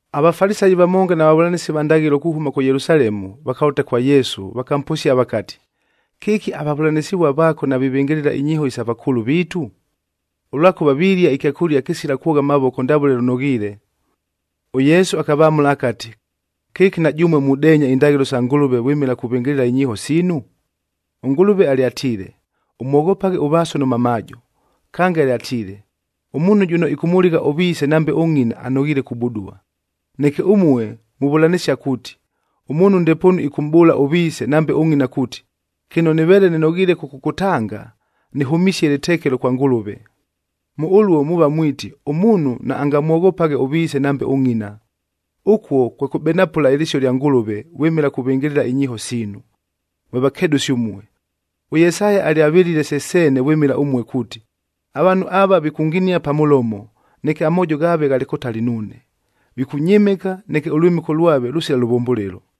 AVafalisayi vamonga na vavʉlanɨsi va ndaghɨlo kuhʉma kʉ Yelusalemu, vakalʉta kwa Yesu, vakamposia vakati, “Kɨki avavʉlanɨsɨvua vaako navivɨngɨlɨla inyiiho isa vakʉʉlʉ viitu? Ʉlwakʉva vilia ɨkyakʉlia kɨsila kwogha amavoko ndavʉle lʉnoghiile!” ɄYesu akavamʉla akati, “Kɨki na jʉmue mudeenya indaghɨlo sa Ngʉlʉve vwɨmɨla kuvɨngɨlɨla inyiiho siinu? ɄNgʉlʉve alyatiile, ‘Ʉmwoghopaghe ʉvaaso nʉ mamaajo.’a Kange alyatiile, ‘Ʉmuunhu jʉno ɨkʉmʉligha ʉviise nambe ʉngʼina, Neke ʉmue muvʉlanɨsia kuuti, ʉmuunhu ndepoonu ɨkʉmʼbʉʉla ʉviise nambe ʉngʼina kuuti, ‘Kɨno nɨveele nɨnoghiile kʉkʉkʉtanga, nɨhʉmisie lɨtekelo kwa Ngʉlʉve.’ Mʉ ʉluo, muuva mwiti, ʉmuunhu naangamwoghopaghe ʉviise nambe ʉngʼina. Ʉkuo kwe kʉbenapʉla ɨlɨsio lya Ngʉlʉve vwɨmɨla kuvɨngɨlɨla inyiiho siinu. Mwe vakedʉsi ʉmue! ɄYesaya alyavɨlile se seene vwɨmɨla ʉmue kuuti, ‘Avaanhu ava vikʉnginia pa mʉlomo, neke amoojo ghaave ghalɨ kʉtali nuune. Vikʉnyɨmɨka, neke ʉlwɨmɨko lwave lʉsila lʉvʉmbʉlɨlo,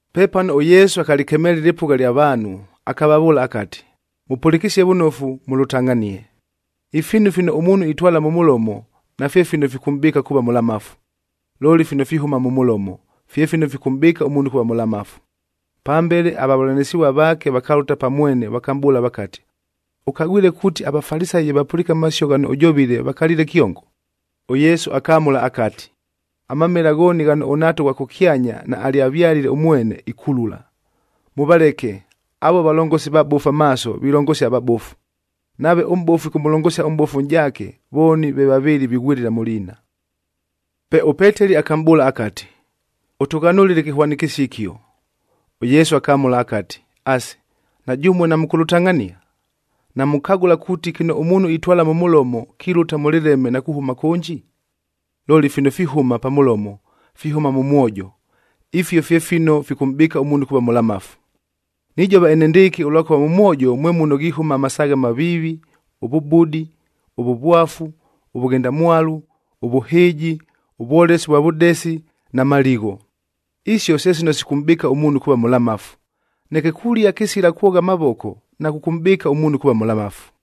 Pepano ʉYesu akalɨkemeela ɨlɨpʉgha lya vaanhu, akavavʉʉla akati, “Mʉpʉlɨkɨsie vʉnofu, mʉlʉtangʼhanie! Ifiinu fino ʉmuunhu itwala mʉ mʉlomo, nafye fino fikʉmʼbɨɨka kuuva mʉlamafu. Looli, fino fihʉma mʉ mʉlomo, fye fino fikʉmʼbɨɨka ʉmuunhu kuuva mʉlamafu.” Pambele avavʉlanɨsɨvua vaake vakalʉta pa mwene vakamʼbʉʉla vakati, “Ʉkagwile kuuti aVafalisayi ye vapʉliike amasio ghano ʉjovile, vakaliile kyongo?” ɄYesu akamʉla akati, “Amamela ghooni ghano ʉNhaata ʉghwa kʉkyanya naalyavyalile ʉmwene, ikulula. Mʉvaleke, avuo valongosi vabofu amaaso vilongosia avabofu. Nave ʉmʼbofu ɨkʉmʉlongosia ʉmʼbofu ʉnʼjaake, vooni ve vavɨɨlɨ vighwɨlɨla mʉ liina!” Pe ʉPeteli akamʼbʉʉla akati, “Ʉtʉghanʉlɨle ɨkɨhwanɨkɨsio ɨkio.” ɄYesu akamʉla akati, “Asi, na jʉmue namʉkʉlʉtangʼhania? Namukagʉla kuuti kɨno ʉmuunhu itwala mʉ mʉlomo, kilʉta mʉ lɨleme na kuhʉma kʉnji? Looli fino fihʉma pa mʉlomo, fihʉma mʉ mwojo, ifio fye fino fikʉmʼbɨɨka ʉmuunhu kuuva mʉlamafu. Nijova enendɨɨkɨ, ʉlwakʉva mʉ mwojo mwe muno ghihʉma amasaaghe amaviivi, ʉvʉbudi, ʉvʉvwafu, ʉvʉghendamwalu, ʉvʉhɨɨji, ʉvwolesi vwa vʉdesi na maligho. Isio, se sino sikʉmʼbɨɨka ʉmuunhu kuuva mʉlamafu. Neke kulia kɨsila kwogha amavoko nakʉkʉmʼbɨɨka ʉmuunhu kuuva mʉlamafu.”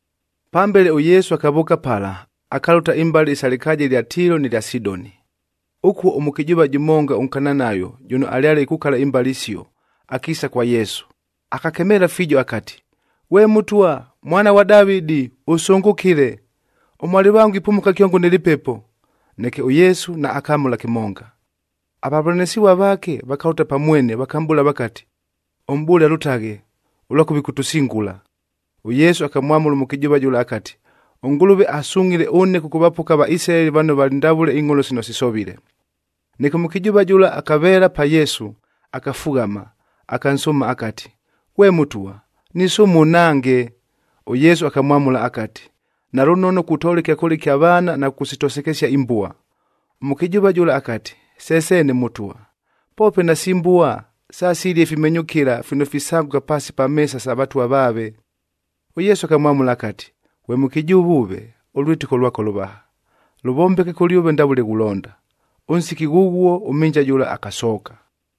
Pambele ʉYesu akavʉʉka pala, akalʉta imbale isa lɨkaaja ɨlya Tiilo nɨ lya Sidoni. Ʉkuo ʉmʉkɨjʉʉva jʉmonga ʉNkananayo jʉno alyale ikukala imbale isio, akiisa kwa Yesu, akakemeela fiijo akati, “Ghwe Mʉtwa, Mwana ghwa Davɨdi, ʉsʉngʉkɨle! Ʉmwalɨvango ipumuka kyongo nɨ lɨpepo.” Neke ʉYesu naakamʉla kɨmonga. Avavʉlanɨsɨvua vaake vakalʉta pa mwene vakamʼbʉʉla vakati, “Ʉmʼbʉʉle alʉtaghe, ʉlwakʉva ɨkʉtʉsingula.” ɄYesu akamwamʉla ʉmʉkɨjʉʉva jʉla akati, “ɄNgʉlʉve asungʼhile ʉne kʉkʉvapoka aVaisilaeli vano valɨ ndavʉle ingʼholo sino sisovile.” Neke ʉmʉkɨjʉʉva jʉla akaveela pa Yesu, akafughama, akansʉʉma akati, “Ghwe Mʉtwa, nisʉʉma ʉnhange!” ɄYesu akamwamʉla akati, “Nalʉnono kutoola ɨkyakʉlia ɨkya vaana na kʉkʉsitosekesia imbua.” Ʉmʉkɨjʉʉva jʉla akati, “Se seene Mʉtwa, poope nasi mbua sasilia ifimenyʉkɨla fino fisangʉka paasi pa meesa sa vatwa vaave.” ɄYesu akamwamʉla akati, “Ghwe mʉkɨjʉʉva ʉve, ʉlwɨtɨko lwako lʉvaha! Lʉvombeke kʉlyʉve ndavʉle ghulonda.” Ʉnsiki ghʉghuo, ʉmhɨnja jʉla akasooka.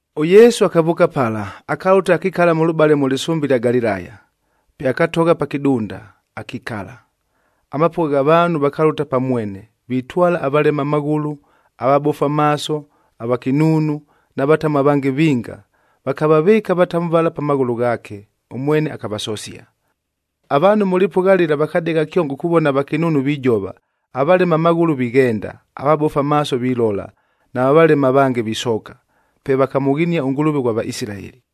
ɄYesu akavʉʉka pala, akalʉta akakila mʉlʉbale mʉ lɨsʉmbe ɨlya Galilaya. Pe akatogha pa kɨdunda, akikala. Amapʉgha gha vaanhu vakalʉta pa mwene, vitwala avalema amaghʉlʉ, avabofu amaaso, avakɨnuunu na vatamu avange vinga, vakavavɨɨka avatamu vala pa maghʉlʉ ghaake, ʉmwene akavasosia. Avaanhu mʉ lɨpʉgha lɨla vakadegha kyongo kuvona avakɨnuunu vijova, avalema amaghʉlʉ vighenda, avabofu amaaso vilola na valema avange visooka. Pe vakamʉghinia ʉNgʉlʉve ʉghwa Vaisilaeli.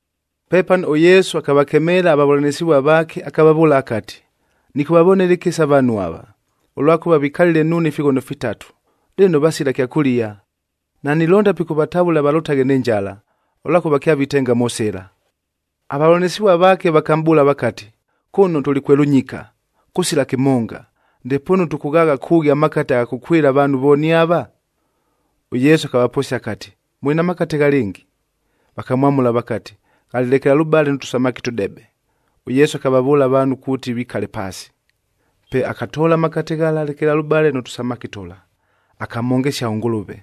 Pepano ʉYesu akavakemeela avavʉlanɨsɨvua vaake, akavavʉʉla akati, “Nɨkʉvavonela ɨkɨsa avaanhu ava, ʉlwakʉva vikalile nuune ifighono fitatu, lɨno vasila kyakʉlia. Nanilonda pikʉvatavʉla valʉtaghe nɨ njala, ʉlwakʉva kyavitenga mʉ sɨla.” Avavʉlanɨsɨvua vaake vakamʼbʉʉla vakati, “Kʉno tʉlɨ kwe lʉnyika, kʉsila kɨmonga, ndepoonu tʉkʉghaagha kʉʉghi amakate agha kʉkwɨla avaanhu vooni ava?” ɄYesu akavaposia akati, “Mʉlɨ na makate ghalɨngi?” Vakamwamʉla vakati, “Ghalɨ lekelalʉbale nʉ tʉsamaki tʉdebe.” ɄYesu akavavʉʉla avaanhu kuuti vikale paasi. Pe akatoola amakate ghala lekelalʉbale nʉ tʉsamaki tʉla, akamhongesia ʉNgʉlʉve,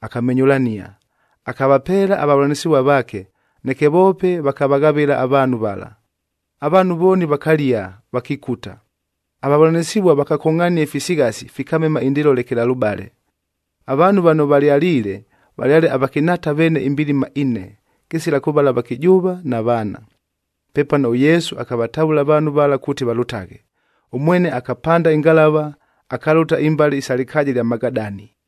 akamenyʉlania, akavapeela avavʉlanɨsɨvua vaake, neke voope vakavaghavɨla avaanhu vala. Avaanhu vooni vakalia, vakikuta. Avavʉlanɨsɨvua vakakongʼhania ifisighasi, fikamema indɨɨlo lekelalʉbale. Avaanhu vano valyaliile, valyale avakɨnhaata veene imbilima ine, kɨsila kʉvala avakɨjʉʉva na vaana. Pepano ʉYesu akavatavʉla avaanhu vala kuuti valʉtaghe, ʉmwene akapanda ɨngalava, akalʉta imbale isa lɨkaaja ɨlya Magadani.